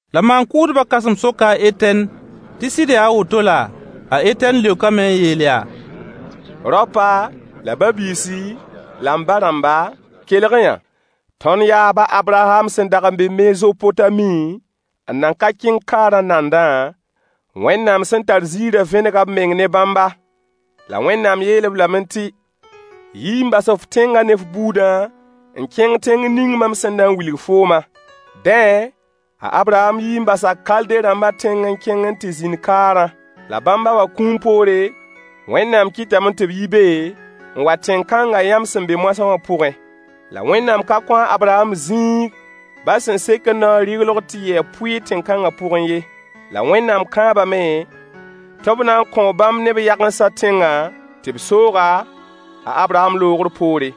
La maan-kʋʋdbã kãsem soka a Etɛn tɩ sɩd yaa a woto laa? A Etɛn leokame n yeel yaa: Raopa, la ba-biisi la m ba-rãmba, kelg-y-yã. Tõnd yaab a Abraham sẽn dag n be Mezopotami n nan ka kẽng kaarã nandã, Wẽnnaam sẽn tar zĩirã vẽnega b meng ne bãmba. La Wẽnnaam yeel-b lame tɩ: “Yi n bas f tẽngã ne f buudã n kẽng tẽng ning mam sẽn na n wilg foomã.” Dẽ, a Abraham yi n basa Kalde-rãmba tẽng n kẽng n tɩ zĩnd kaarã. La bãmb ba wã kũum poore, Wẽnnaam kɩtame tɩ b yi be n wa tẽn-kãnga yãmb sẽn be moasã wã pʋgẽ. La Wẽnnaam ka kõ a Abraham zĩig ba sẽn sekd naoor rɩglog tɩ yɩ a pʋɩɩr tẽng kãngã pʋgẽ ye. La Wẽnnaam kãabame tɩ b na n kõo bãmb ne b yagensã tẽngã tɩ b soog-a, a Abraham loogr poore.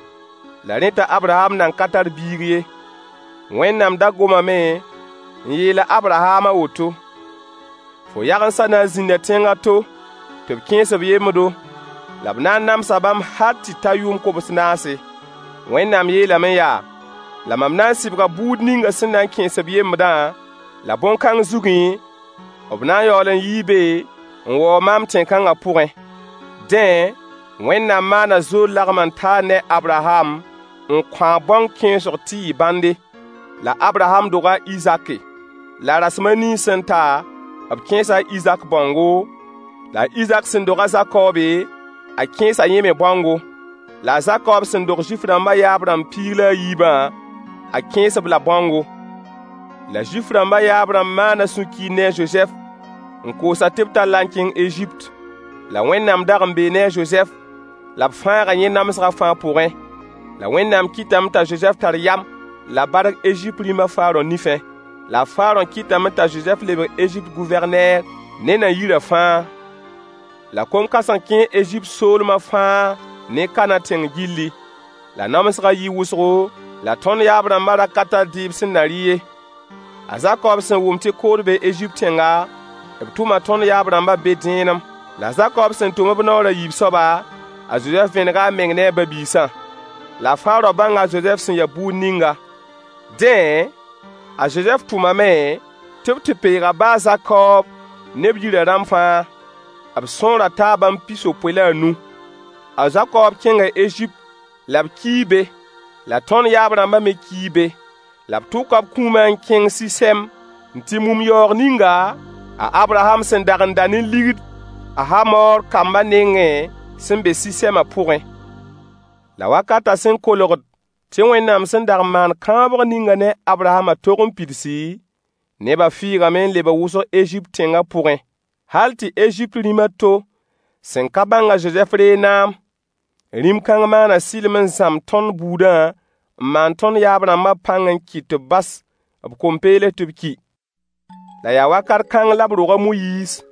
La rẽ t'a Abraham nan ka tar biig ye. Wẽnnaam da gomame n yeel a Abraham a woto: “Fo yagensã na n zĩnda tẽng a to, tɩ b kẽes-b yembdo, la b na n namsa bãmb hal tɩ ta yʋʋm kobs naase.” Wẽnnaam yeelame yaa: “La mam na n sɩbga buud ninga sẽn na n kẽes-b yembdã, la bõn-kãng zugẽ b na n yaool n yii be n waoog maam tẽn-kãnga pʋgẽ.” Dẽ, Wẽnnaam maaana zood lagem-n-taar ne a Abraham n kõ-a bãong kẽesg tɩ yɩ bãnde. La a Abraham doga a Izake. La rasem a nii sẽn ta, b kẽesa a Izak bãongo, la a Izak sẽn dog a Zakobe, a kẽesa yẽ me bãongo. La a Zakob sẽn dog Zuif-rãmba yaab-rãmb piig la a yiibã, a kẽes-b la bãongo. La Zuif-rãmba yaab-rãmb maana sũ-kiir ne a Zozɛf n koos-a tɩ b tall-a n kẽng Ezipt. La Wẽnnaam dag n bee ne a Zozɛf, la b fãaga yẽ namsgã fãa pʋgẽ. La Wẽnnaam kɩtame t'a Zozɛf tar yam la bark Ezipt rĩm a Farõ nifẽ. La Farõ kɩtame t'a Zozɛf lebg Ezipt Gʋvɛrneer ne na-yirã fãa. La kom-kãseng n kẽ Ezipt soolma fãa ne Kana tẽng gilli, la namsgã yɩɩ wʋsgo la tõnd yaab-rãmba ra ka tar dɩɩb sẽn na rɩ ye. A Zakob sẽn wʋm tɩ kood bee Ezipt tẽnga, b tʋma tõnd yaab-rãmba be dẽenem. La a Zakob sẽn tʋm-b naoor a yiib soaba, a Zozɛf vẽnega a meng ne a ba-biisã. La Farõ bãnga a Zozɛf sẽn ya buud ninga. Dẽ, a Zozɛf tʋmame tɩ b tɩ peeg a ba a Zakob ne b yirã rãmb fãa, b sõora taa bãmb pis-yopoe la a nu. A Zakob kẽnga Ezipt la b kii be. La tõnd yaab-rãmba me kii be. La b tʋka b kũuma n kẽng Sɩsɛm n tɩ mum yaoog ninga a Abraham sẽn dag n da ne ligd a Hamoor kamba nengẽ sẽn be Sɩsɛma pʋgẽ. La wakatã sẽn kolgd tɩ Wẽnnaam sẽn dag n maan kãabg ninga ne a Abrahamã tog n pidsi, neba fɩɩgame n lebg wʋsg Ezipt tẽngã pʋgẽ, hal tɩ Ezipt rĩm a to sẽn ka bãng a Zozɛf reeg naam. Rĩm kãng maana sɩlem n zãmb tõnd buudã n maan tõnd yaab-rãmbã pãng n kɩt tɩ b bas b kom-peels tɩ b ki. La yaa wakat kãng la b rog a Moyiis.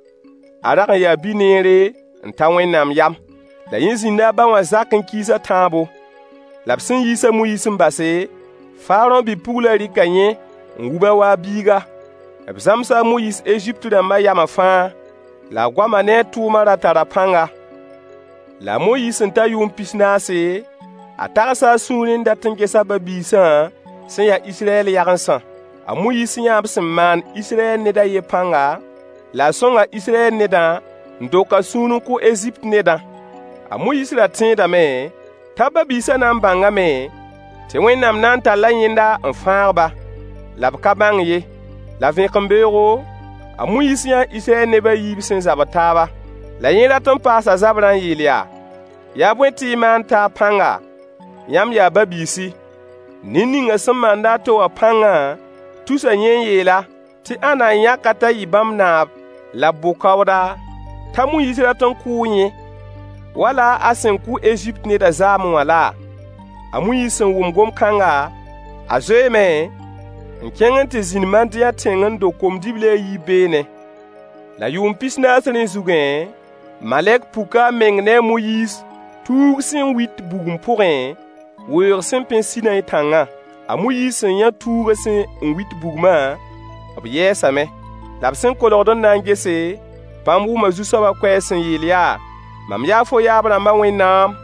A rag n yaa bi-neere n ta Wẽnnaam yam. La yẽ zĩnda a ba wã zakẽ kiis a tãabo. La b sẽn yiis a Moyiis n base, Farõ bi-pugla rɩka yẽ n wub-a wa a biiga. B zãmsa a Moyiis Ezipt-rãmba yama fãa. La a goama ne a tʋʋma ra tara pãnga. La a Moyiis sẽn ta yʋʋm pis naase, a tags a sũurẽ n dat n gesa a ba-biisã sẽn ya Israyɛl yagensã. A Moyiis yãa b sẽn maand Israyɛl ned a yen pãnga, la a sõnga Israyɛl nedã n dok a sũur n kʋ Ezipt nedã. A Moyiis ra tẽedame t'a ba-biisã na n bãngame tɩ Wẽnnaam na n talla yẽnda n fãag ba. La b ka bãng ye. La vẽkembeoogo, a Moyiis yãa Israyɛl neb a yiib sẽn zabd taaba. La yẽ rat paas a zabrã n yeel yaa: “Yaa bõe tɩ y maan taab pãnga? Yãmb yaa ba-biisi.” Ned ninga sẽn maand a to wã pãngã tusa yẽ n yeel-a tɩ ãnna n yãk-a t'a yɩ bãmb naab la b bʋ-kaooda, t'a Moyiis rat kʋʋ yẽ wala a sẽn kʋ Ezipt nedã zaame wã laa? A Moyiis sẽn wʋm gom-kãngã, a Zoeeme n kẽng n tɩ zĩnd Madiyã tẽng n dog kom-dibli a yiib beene. La yʋʋm pis naas rẽ zugẽ, malɛk puka a meng ne a Moyiis tuug sẽn wit bugum pʋgẽ weoog sẽn pẽ Sinayi tãngã. A Moyiis sẽn yã tuugã sẽn wit bugmã b yɛɛsame. La b sẽn kolgd n na n gese, bãmb wʋma Zu-soaba koɛɛg sẽn yeel yaa: “Mam yaa fo yaab-rãmba Wẽnnaam.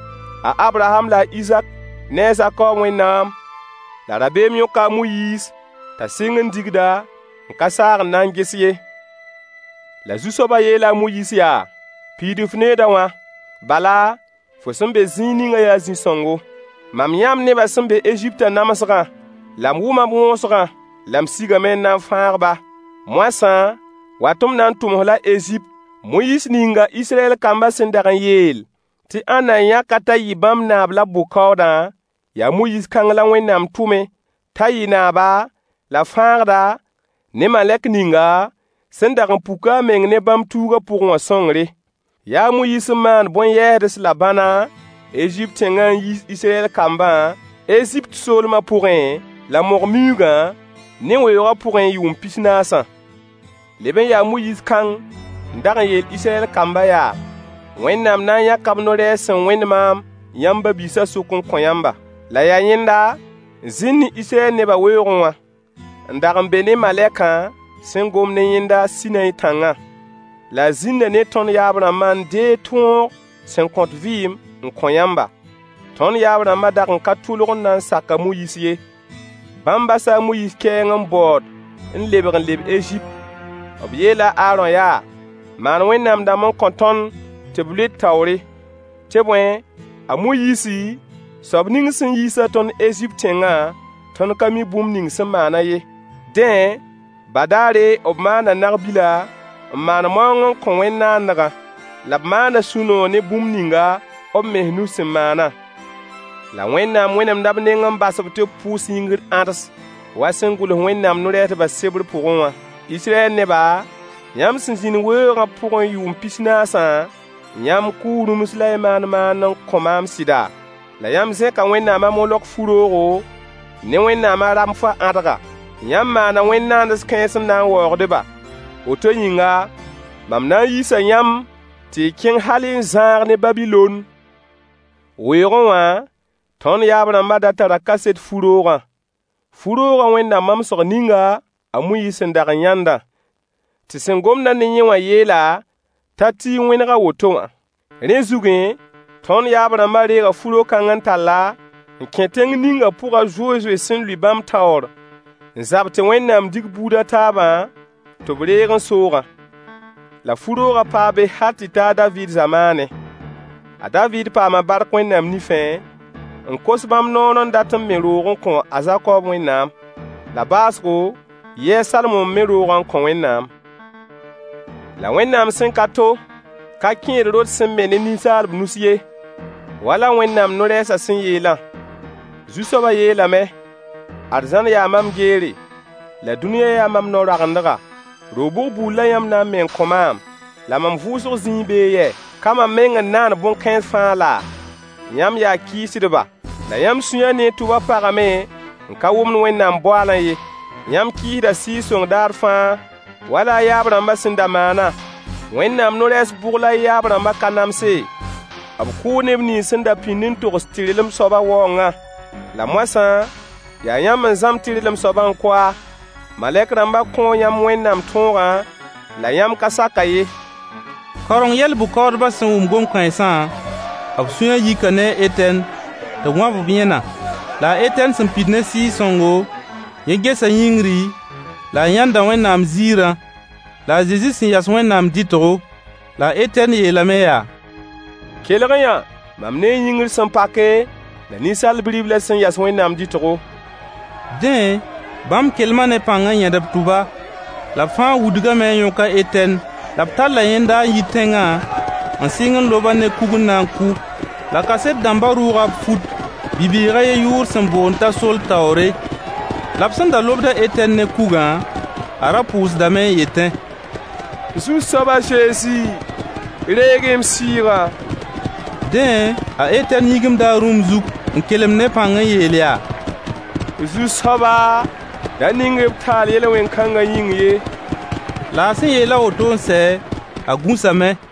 A Abraham la a Izak ne a Zakob Wẽnnaam.” La rabeem yõka a Moyiis t'a sɩng n digda, n ka saag n na n ges ye. La Zu-soaba yeela a Moyiis yaa: “Piid f neooda wã, bala fo sẽn be zĩig ningã yaa zĩ-sõngo. Mam yãa m nebã sẽn be Eziptã namsgã, la m wʋma b wõosgã. La m sigame n na n fãag-ba. Moasã, wa tɩ m na n tʋm-f la Ezipt.” Moyiis ninga Israyɛl kamba sẽn dag yeel tɩ ãnna yãk-a t'a yɩ bãmb naab la b bʋ-kaoodã, yaa Moyiis kãng la Wẽnnaam tʋmy t'a yɩ naaba la fãagda, ne malɛk ninga sẽn dag n puk a meng ne bãmb tuugã pʋgẽ wã sõngre. Yaa a Moyiis n maan bõn-yɛɛsds la bãna Ezipt tẽngã n yiis Israyɛl kambã Ezipt soolma pʋgẽ la mog-miuugã ne weoogã pʋgẽ yʋʋm pis-naasã. Leb n ya a Moyiis kãng n dag n yeel Israyɛl kambã yaa: “Wẽnnaam na n yãka b no-rɛɛs sẽn wẽnd maam yãmb ba-biisã sʋk n kõ yãmba.” La yaa yẽnda n zĩnd ne Israyɛl nebã weoogẽ wã, n dag n be ne malɛkã sẽn gomd ne yẽnda Sinayi tãngã. La a zĩnda ne tõnd yaab-rãmbã n deeg tõog sẽn kõt vɩɩmã n kõ yãmba. Tõnd yaab-rãmbã rag n ka tʋlg n na n sak a Moyiis ye. Bãmb basa a Moyiis kɛɛnga n baood n lebg n leb Ezipt. B yeela a Aarõ yaa: “Maan wẽnnaam-dãmb n kõ tõnd tɩ b lʋɩ d taoore. Tɩ bõe, a Moyiisi, soab ning sẽn yiis-a tõnd Ezipt tẽngã, tõnd ka mi bũmb ning sẽn maan-a ye.” Dẽ, badaare b maana nag-bila, n maan maoong n kõ wẽnd-naandgã, la b maana sũ-noog ne bũmb ninga b mens nus sẽn maana. La Wẽnnaam wẽnemda b neng n bas-b tɩ b pʋʋs yĩngr ãds wa sẽn gʋls Wẽnnaam no-rɛɛsdbã sebr pʋgẽ wã: “Israyɛl neba, yãmb sẽn zĩnd weoogã pʋgẽ yʋʋm pis-naasã, yãmb kʋʋ rũms la y maan maand n kõ maam sɩda? La yãmb zẽka wẽnnaam a molok fu-roogo ne wẽnnaam a Ramfã ãdga. Yãmb maana wẽnd-naands kãens n na n waoogd-ba. Woto yĩnga, mam na n yiisa yãmb tɩ y kẽng hal n zãag ne Babilon.” Weoogẽ wã tõnd yaab-rãmba da tara kaset fu-roogã. Fu-roogã wẽnda mamsg ninga a Moyiis sẽn dag n yãndã, tɩ sẽn gomd-a ne yẽ wã yeel-a t'a ti n wẽneg a woto wã. Rẽ zugẽ, tõnd yaab-rãmba reega fu-ro-kãng n tall-a n kẽ tẽng ninga pʋg a Zozoe sẽn lʋɩ bãmb taoor n zab tɩ Wẽnnaam dig buud a taabã tɩ b reeg n soogã, la fu-roogã paa be hal tɩ ta a Daviid zamaane. A Daviid paama bark Wẽnnaam nifẽ, n kos bãmb noor n dat n me roog n kõ a Zakob Wẽnnaam. La baoosgo yɩɩ a Salmo n me roogã n kõ Wẽnnaam. La Wẽnnaam sẽn-ka-to ka kẽed rot sẽn me ne ninsaalb nus ye. Wala Wẽnnaam no-rɛɛsa sẽn yeelã: Zu-soaba yeelame: “Arzãn yaa mam geere la dũniyã yaa mam nao-raogendga. Ro-bʋg buud la yãmb na n me n kõ maam? La mam vʋʋsg zĩig bee yɛ? Ka mam meng n naan bõn-kãens fãa laa?” Yãmb yaa kɩɩsdba. La yãmb sũyã ne y tʋba pagame n ka wʋmd Wẽnnaam boaalã ye. Yãmb kɩɩsda Sɩɩg-sõng daar fãa wala y yaab-rãmbã sẽn da maana. Wẽnnaam no-rɛɛs bʋg la y yaab-rãmbã ka namse? B kʋʋ neb nins sẽn da pĩnd n togs tɩrlem soaba waoongã. La moasã, yaa yãmb n zãmb tɩrlem soabã n kʋ-a. Malɛk-rãmba kõo yãmb Wẽnnaam tõogã la yãmb ka sak-a ye. Kaoreng yɛl-bʋ-kaoodbã sẽn wʋm gom-kãensã, b sũyã yika ne a Etɛn tɩ b wãb b yẽna. La a Etɛn sẽn pid ne Sɩɩg-sõngo, yẽ gesa yĩngri la a yãnda Wẽnnaam ziirã, la a Zezi sẽn yas Wẽnnaam dɩtgo. La a Etɛn yeelame yaa: Kelg-y yã, mam nee yĩngr sẽn pake la Ninsaal Bi-riblã sẽn yas Wẽnnaam dɩtgo. Dẽ, bãmb kelma ne pãng n yẽd b tʋba. La b fãa wudgame n yõk a Etɛn. La b talla yẽnda n yi tẽngã n sɩng n lob-a ne kug n na n kʋ. La kaset dãmba rʋʋga b fut bi-bɩɩg a yen yʋʋr sẽn boond t'a Soll taoore. La b sẽn da lobd a Etɛn ne kugã, a ra pʋʋsdame n yetẽ: Zu-soab a Zezi, reeg-y m sɩɩgã. Dẽ, a Etɛn yĩgimda a rũm zug n kelem ne pãng n yeel yaa: Zu-soaba da ning-y b taal yel-wẽn-kãnga yĩng ye. La a sẽn yeel a woto n sɛ, a gũsame.